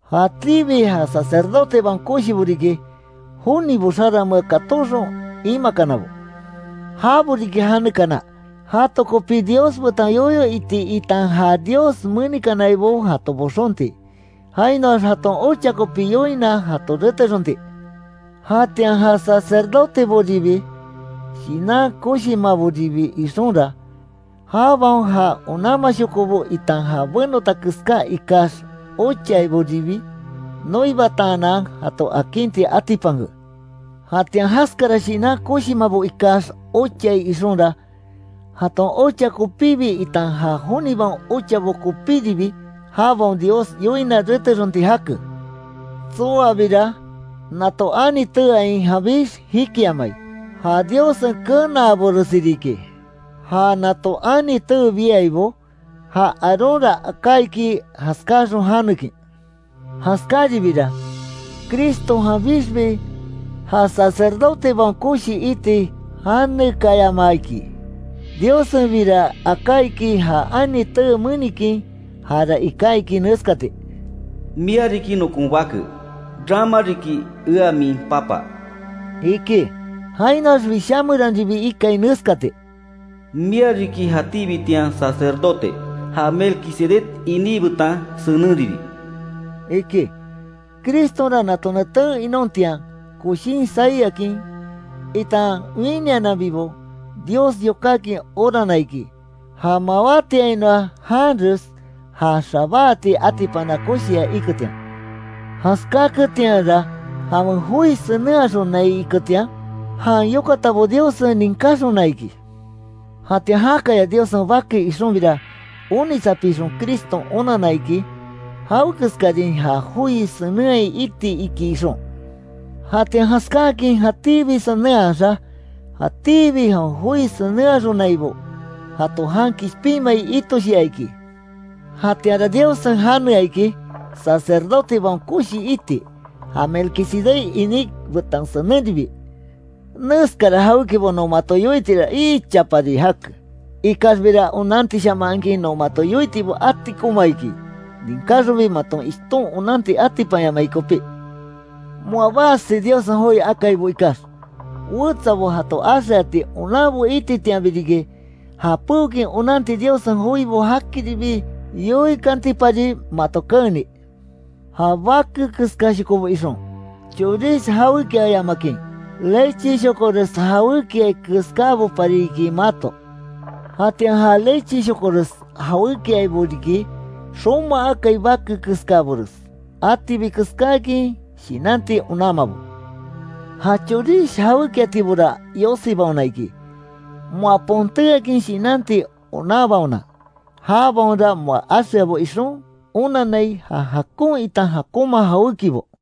Jatíbi ja sacerdotebaon koshibo riki, jonibo xaranmea katóxon, imakanabo. Jabo riki janekana, jato kopi Dios betan yoyo iti itan ja Dios menikanaibo jato boxonti, jainoax jaton ocha kopi yoina jato retexonti. Jatian ja sacerdoteboribi, shinan koshimaboribi ixonra, jabaon ja onanmashokobo itan ja benota keská ikax ochaiboribi, noibataanan, jato akinti atipanke. Jatian jaskara shinan koshimabo ikax ochai ixonra, jaton ocha kopibi itan ja jonibaon ochabo kopíribi jabaon Dios yoina retexonti jake. Tsoabira, nato ani teeain janbix jikiamai, ja Diossen kenaabores riki, ja nato ani tee biaibo, ja Aarónra aká iki, jaskáaxon janekin. Jaskáribira, Cristo janbixbi ja Sacerdotebaon Koshi iti janekaayama iki, Diossenbira aká iki, ja ani tee menikin, jara iká iki neskati: “Mia riki nokon bake, rama riki ea min Papa”, iki. Jainoax Wishá meranribi ikai neskati: “Mia riki jatíbitian Sacerdote, ja Melquisedec iní betan senenribi”, iki. Cristonra nato neten inontian, koshin sai akin, itan winiananbibo, Dios yokákin orana iki, ja mawátiainoa janres já xabáati atipana koshia iketian; jaskáketianra, jawen joi senenhaxonai iketian, jan yokatabo Diossen ninkáxona iki. Jatian jakaya Diossen Bake ixonbira, onitsapixon Criston onanna iki, jawekeskarin ja joi senenhai iti iki ixon, jatian jaskáakin jatíbi senenhaxa, jatíbi jawen joi senenhaxonaibo, jato jan kishpinmai itoshia iki. Jatianra Diossen janea iki Sacerdotebaon Koshi iti, ja Melquisedec iní betan senenribi. Neskara jawékibo non mato yoitira ichapari jake, ikaxbira onantishamahakin non mato yoitibo atikoma iki, ninkáxonbi maton ishton onanti atipanyamai kopí. Moa basi Diossen joi akaibo ikax, wetsabo jato axeati onanbo ititianbi riki, ja peokin onanti Diossen joibo jakiribi yoikantinpari mato keeni. Ja bake keskáshokobo ixon, chorish jawékiayamakin, lecheshokores jawékiai keskábopari iki mato. Jatian ja lecheshokores jawékiaibo riki, xoma akai bake keskabores, atibi keskákin shinanti onanmabo. Ja chorish jawékiatibora yosibaona iki, moa pontéakin shinanti onanbaona. Jabaonra moa axeabo ixon, onannai ja jakon itan jakonma jawékibo.